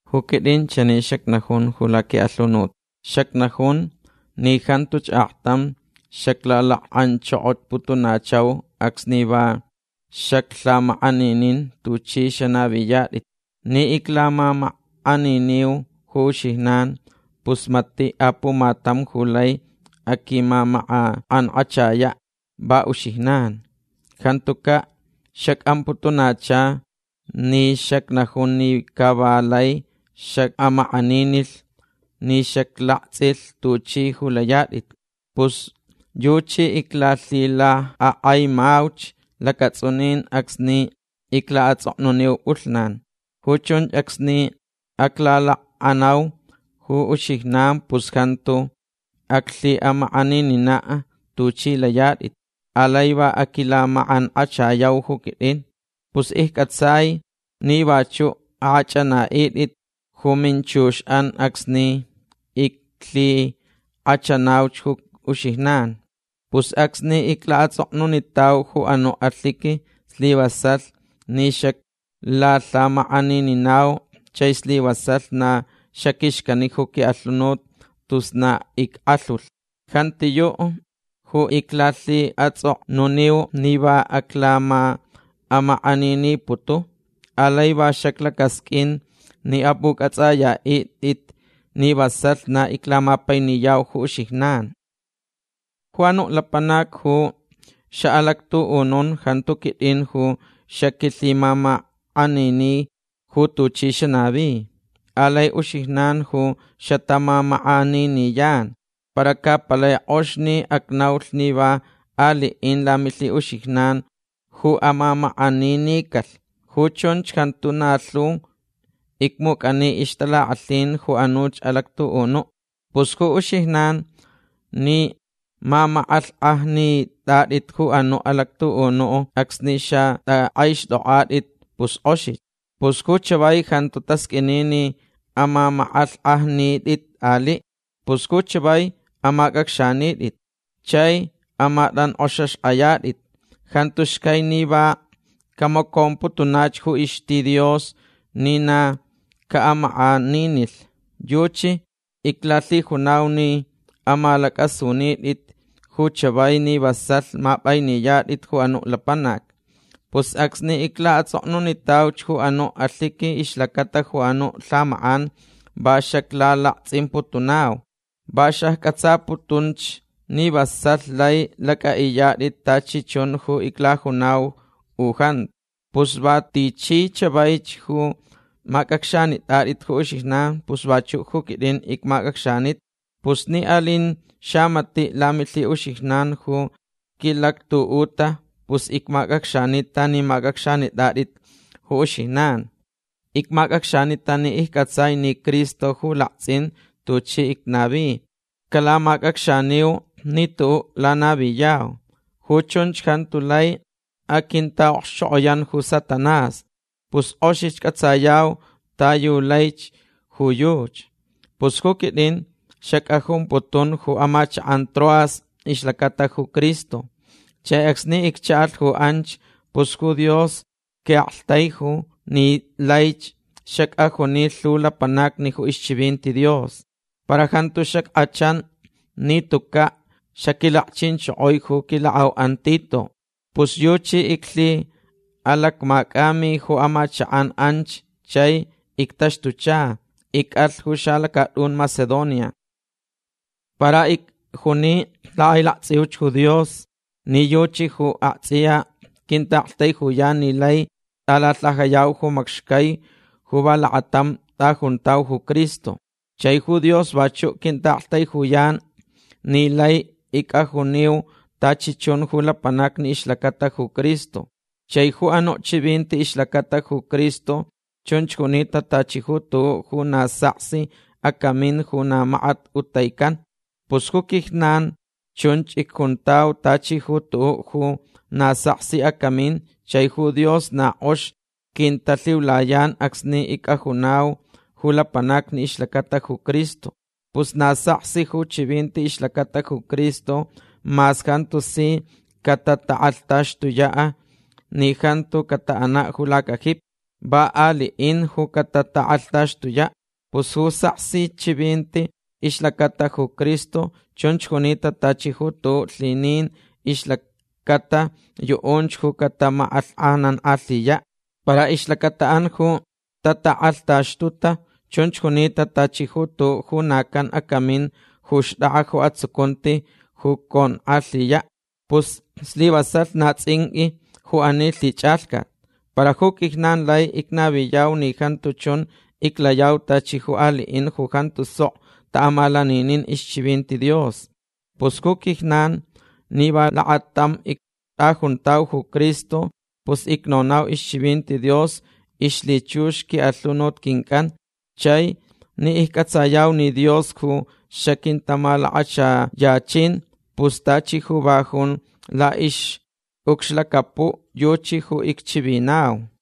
Ju quit'in chani xacnajun ju laqui'alhunut. Xacnajun ni jantuch aktam xaclalak'anchokoputunachau acsni va xaclhamak'aninin tuch'i xanaviyat'it. Ni iclamamak'aniniu ju uxijnan pus mati' apumatam ju lai aquimak'ank'achaya'. Va uxijnan. Jantuca' xac'amputunacha ni xacnajun ni ca va lai xac'amak'aninilh ni xaclakts'ilh tuch'i ju layat'it. Pus yuchi iclalhilak'ak'aimauch lacats'unin acsni icla'ats'oknuniu p'ulhnan. Ju chunch acsni aclalakcha'anau ju uxijnan pus jantu aclhi'amak'aninina' tuch'i layat'it. Alai va aquilamak'ank'achayau ju quit'in. Pus icc'atsai ni vachu' ak'ach'ana'it'it ju minchux'an acsni iclalhik'achanauch ju uxijnan. Pus acsni icla'ats'oknunitau ju anu' alhiqui slivasalh ni xaclalhamak'anininau chai slivasalh na xaquixcani ju qui'alhunut tus na ick'alhulh. Jantiyu' ju iclalhi'ats'oknuniu ni va aclama'amak'aniniputu. Alai va xaclacasq'uin ni ap'uc'ats'aya'it'it ni vasalh na iclamapainiyau ju uxijnan. Ju anu' lapanac ju xa'alactu'unun jantu quit'in ju xaquilhimamak'anini ju tuchi xanavi. Alai uxijnan ju xatamamak'aniniyan. Para ca palai k'ox ni acnaulh ni va ali'in lamilhi'uxijnan'an ju amamak'aninicalh. Ju chunch jantu na lhu icmuc'ani ixtalak'alhin ju anuch alactu'unu'. Pus ju uxijnan ni mamak'alhk'ajnit'at'it ju anu' alactu'unu' acsni xat'ak'aixt'ok'at'it pus k'oxich. Pus ju chavai jantu tasq'uini ni amamak'alhk'ajnit'it ali'. Pus ju chavai amac'acxanit'it chai amatank'oxaxk'ayat'it. Jantu xcai ni va camacomputunach ju ixti Dios ni na ca'amak'aninilh. Yuchi iclalhijunau ni amalac'asunit'it ju chavai ni vasalh map'ainiyat'it ju anu' lapanac. Pus acsni icla'ats'oknunitauch ju anu' alhiqui ixlacata ju anu' lhamak'an va xaclalakts'imputunau. Va xacc'atsaputunch ni vasalh lai lac'a'iyat'it tachi chun ju iclajunau u jantu. Pus va tichi chavaich ju mac'acxanit'at'it ju uxijnan pus vachu' ju quit'in icmac'acxanita. Pus ni alinch xamati' lamilhi'uxijnan ju quilactu'uta pus icmac'acxanita ni mac'acxanit'at'it ju uxijnan. Icmac'acxanita ni icc'atsai ni Cristo ju lakts'in tuchi icnavi. Calamac'acxaniu ni tu'u' lanaviyau. Ju chunch jantu lai aquinta'okxchok'oyan ju Satanás. Pus k'oxich c'atsayau ta yu laich ju yuchi. Pus ju quit'in xac'ajumputun ju amachak'an Troas ixlacata ju Cristo. Chai acsni iccha'alh ju anch pus ju Dios qui'aktaiju ni laich xac'ajuni lhu lapanacni ju ixchivinti Dios. Para jantu xack'achan ni tuca' xaquilakchinchokoi ju quilak'au'an Tito. Pus yuchi iclhi'alacmac'ami ju amachak'an anch chai ictaxtucha. Ic'alh ju xalacat'un Macedonia. Para icjuni lak'ailakts'iuch ju Dios ni yuchach ju akts'iya quinta'aktaijuyan ni lai t'alalhajayau ju macxcai ni va lakatam t'ajuntau ju Cristo. Chai ju Dios vachu' quinta'aktaijuyan ni laich ic'ajuniu tachi chun ju lapanacni ixlacata ju Cristo. Chai ju anu' chivinti ixlacata ju Cristo chunch junita tachi ju tu'u' ju na saksi acamin ju na makat ujtaican. Pus ju quijnan chunch icjuntau tachi ju tu'u' ju na saksi acamin chai ju Dios na k'ox quintalhiulayan acsni ic'ajunau ju lapanacni ixlacata ju Cristo. Pus na saksi ju chivinti ixlacata ju Cristo mas jantu si catatak'alhtaxtuya' ni jantu cata'ana' ju lacajipi. Va ali'in ju catatak'alhtaxtuya'. Pus ju saksi chivinti ixlacata ju Cristo chunch junita tachi ju tu'u' lhinin ixlacata yu'unch ju catamak'alhk'ajnank'alhiya'. Para ixlacata'an ju tatak'alhtaxtuta chunch junita tachi ju tu'u' ju na can acamin ju xt'ak'a ju atsucunti ju conk'alhiya'. Pus slivasalh na ts'inq'ui ju ani lhich'alhcat. Para ju quijnan lai icnaviyau ni jantu chun iclayau tachi ju ali'in ju jantu sok ta'amalaninin ixchivinti Dios. Pus ju quijnan ni va lakatam ict'ajuntau ju Cristo pus icnonau ixchivinti Dios la'ixlhichux qui'alhunut quinc'an. Chai ni icc'atsayau ni Dios ju xaquintamalakachayachin pus tachi ju va jun la'ix'ucxlacapu' yuchi ju icchivinau.